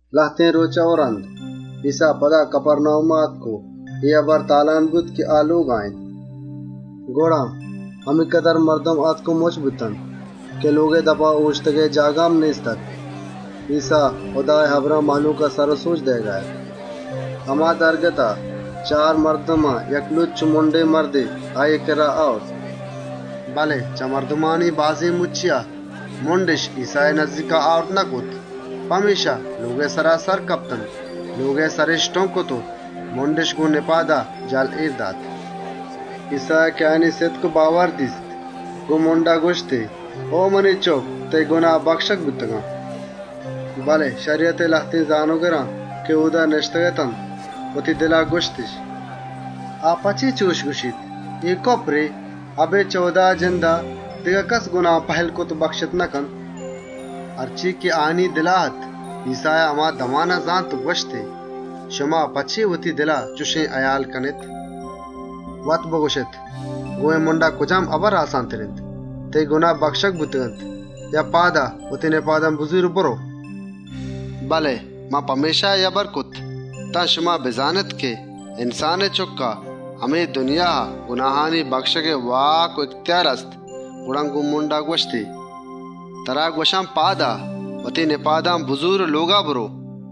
‏ لهتێن رۆچا و رَند، ایسّا پدا کَپَرناهوما آتک و اے هبر شِنگ و تالان بوت که آ لۆگا اِنت. ‏ گڑا، همینکدر مردم آتک و مُچّ بوت که لۆگئے دپا، اۆشتگئے جاگه هم نێست‌اَت. ایسّا هُدائے هبران مهلوکا درس و سَبک دئیگا اَت. ‏ هما دمانا، چار مردم یک لَنگ و مُنڈێن مردے آییئے کِرّا آرگا اَت، ‏ بله چه مردمانی بازێن مُچّیا، مُنڈِش ایسّائے نزّیکا آورت نکرت. پمێشکا، لۆگئے سرا سر کپتنت، لۆگئے سرِش ٹُنگ کرت و مُنڈِش گۆن نِپادا، جَهل اێر دات. ‏ ایسّایا که آیانی سِتک و باور دیست، گۆن لَنگا گوَشتی: «او منی چُکّ! تئیی گناه بَکشگ بوتنت.» ‏ بله شَریَتئے لهتێن زانۆگر که اۆدا نِشتگ‌اَت، وتی دلا گوَشتِش: ‏ «آ په چے چُشَ گوَشیت؟ اے کُپرے. اَبێد چه هُدائے جندا، دگه کَسّ گناهان پهِلّ کرت و بَکشتَ نکنت.» ‏ هرچے که آیانی دلا اَت، ایسّایا هما دمانا زانت و گوَشتی: «شما په چے وتی دلا چُشێن هئیالَ کنێت. ‏ وت بگوَشێت، گۆن اے لَنگا کجام هبر آسانتر اِنت: ‹تئیی گناه بَکشگ بوتگ‌اَنت› یا: ‹پاد آ، وتی نِپادان بزور و برئو›؟ ‏ بله من پمێشکا اے هبر کرت تان شما بزانێت، من که انسانئے چُکّ آن، منا اے دنیایا گناهانی پهِلّ کنگئے واک و اِهتیار هست.» پدا گۆن آ لَنگا گوَشتی: ‏ «ترا گوَشان، پاد آ، وتی نِپادان بزور و لۆگا برئو.» ‏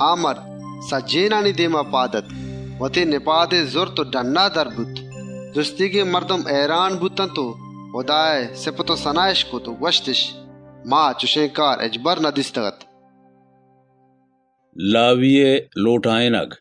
گڑا مرد سجّهێنانی دێما پاد آتک، وتی نِپادی زرتنت و ڈنّا در بوت. سجّهێن مردم هئیران بوتنت، هُدااِش ستا کرت و ساڑات و گوَشتِش: «ما چُشێن کار هچبر ندیستگ‌اَت.» لاویئے لۆٹاێنگ ‏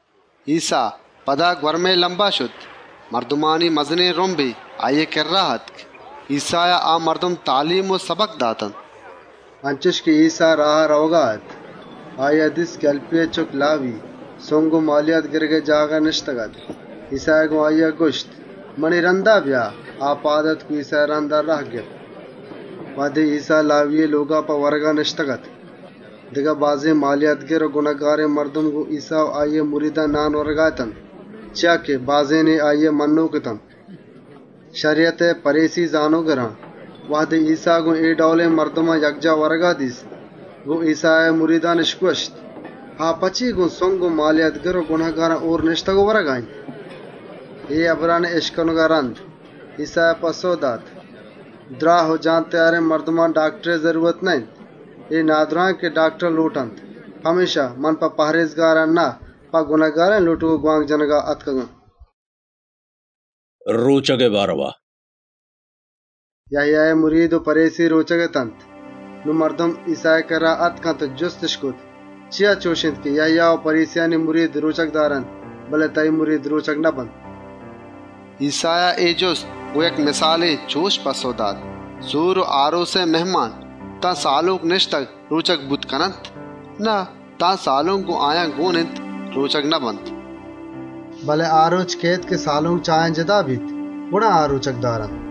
ایسّا، پدا گوَرمئے لَمبا شت. مردمانی مزنێن رُمبے آییئے کِرّا آتک، ایسّایا آ مردم تالیم و سَبک داتنت. ‏ انچُش که ایسّا راها رئوگا اَت، هَلْپیئے چُکّ لاوی‌ای دیست که سُنگ و مالیات گِرگئے جاگها نِشتگ‌اَت. گۆن آییا گوَشتی: «بیا، منی رَندگیریا بکن.» آ پاد آتک و ایسّائے همراه بوت. ‏ وهدے ایسّا لاویئے لۆگا په ورگا نِشتگ‌اَت، دگه بازێن سُنگی و مالیاتگیر و گنهکارێن مردمے گۆن ایسّا و آییئے مریدان نان ورگا اَت. چیا که بازێنے آییئے مَنّۆک اَت. ‏ شَریَتئے پَریسی زانۆگران، وهدے ایسّا گۆن اے ڈئولێن مردمان یکجاه ورگا دیست، گۆن ایسّائے مریدان گوَشتِش: «آ په چے گۆن سُنگی و گنهکاران هۆر نِشتگ و ورگا اِنت؟» ‏ اے هبرانی اِشکنگا رَند، ایسّایا گوَشت: «دْراه و سلامتێن مردمان، داکتر پکار نه‌اِنت، نادْراهان داکتر پکار اِنت. من په پهرێزکاران نئیاتکگان، گنهکارانی لۆٹگ و گوانک جنَگا آتکگان.» رۆچگئے بارئوا ‏ یَهیائے مرید و پَریسی رۆچگ اتنت. نون مردم ایسّائے کِرّا آتکنت و جُستِش کرت: «چیا چُش اِنت که یَهیا و پَریسیانی مرید رۆچگَ دارنت، بله تئیی مرید رۆچگَ نبنت؟» ‏ ایسّایا اے جُست گۆن یک مِسالے چُش پَسّئو دات: «سور و آرۆسئے مهمان، تان سالۆنک نِشتگ، رۆچگ بوتَ کننت؟ نه، تانکه سالۆنک گۆن آیان گۆن اِنت، رۆچگَ نبنت. ‏ بله آ رۆچَ کئیت که سالۆنک چه آیان جِتا کنگَ بیت، گڑا آ رۆچگَ دارنت. ‏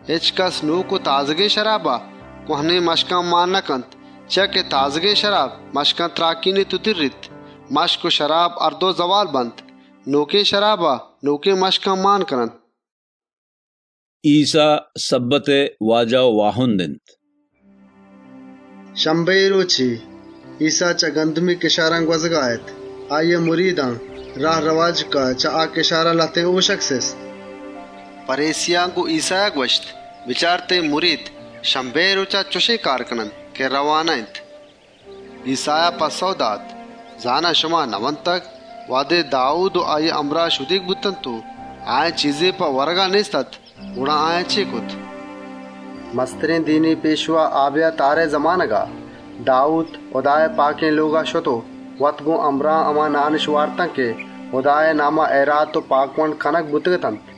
هچکَس هم نۆکێن شرابا، کوَهنێن زِکّان مانَ نکنت، چیا که نۆکێن شراب، زِکّانَ تْراکێنیت و دِرّیت. زِکّ و شراب، هر دو زئوالَ بنت. نۆکێن شرابا، نۆکێن زِکّان مانَ کننت.» ایسّا شَبَّتئے واجه و واهند اِنت ‏ شَبَّتئے رۆچے، ایسّا چه گندمی کِشاران گوَزگا اَت. آییئے مریدان راه رئواجکا چه آ کِشاران لهتێن هۆشگ سِست. ‏ پَریسیان گۆن ایسّایا گوَشت: «بچار، چیا تئیی مرید شَبَّتئے رۆچا اَنچێن کارَ کننت که رئوا نه‌اِنت؟» ‏ ایسّایا گوَشت: «زانا، شما نئوانتگ، وهدے داوود و آییئے همراه شدیگ بوتنت و آیان چیزے په ورگا نێست‌اَت، گڑا داوودا چے کرت؟ ‏ مسترێن دینی پێشوا آبیاتارئے زمانگا، داوود هُدائے پاکێن لۆگا شت و وت گۆن همراهان هُدائے ناما هما هئیراتی و پاکوَنڈێن نانِش وارتنت که،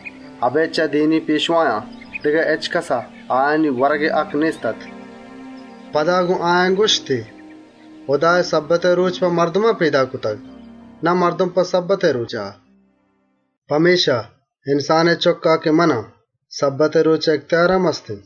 اَبێد چه دینی پێشوایان دگه هچکَسا آیانی ورگئے هَکّ نێست‌اَت.» ‏ پدا، گۆن آیان گوَشتی: «هُدایا شَبَّتئے رۆچ په مردمان پێدا کرتگ، مردم په شَبَّتئے رۆچا پێدا نکرتگ. ‏ پمێشکا، من که انسانئے چُکّ آن، منا شَبَّتئے رۆچئے اِهتیار هم هست.»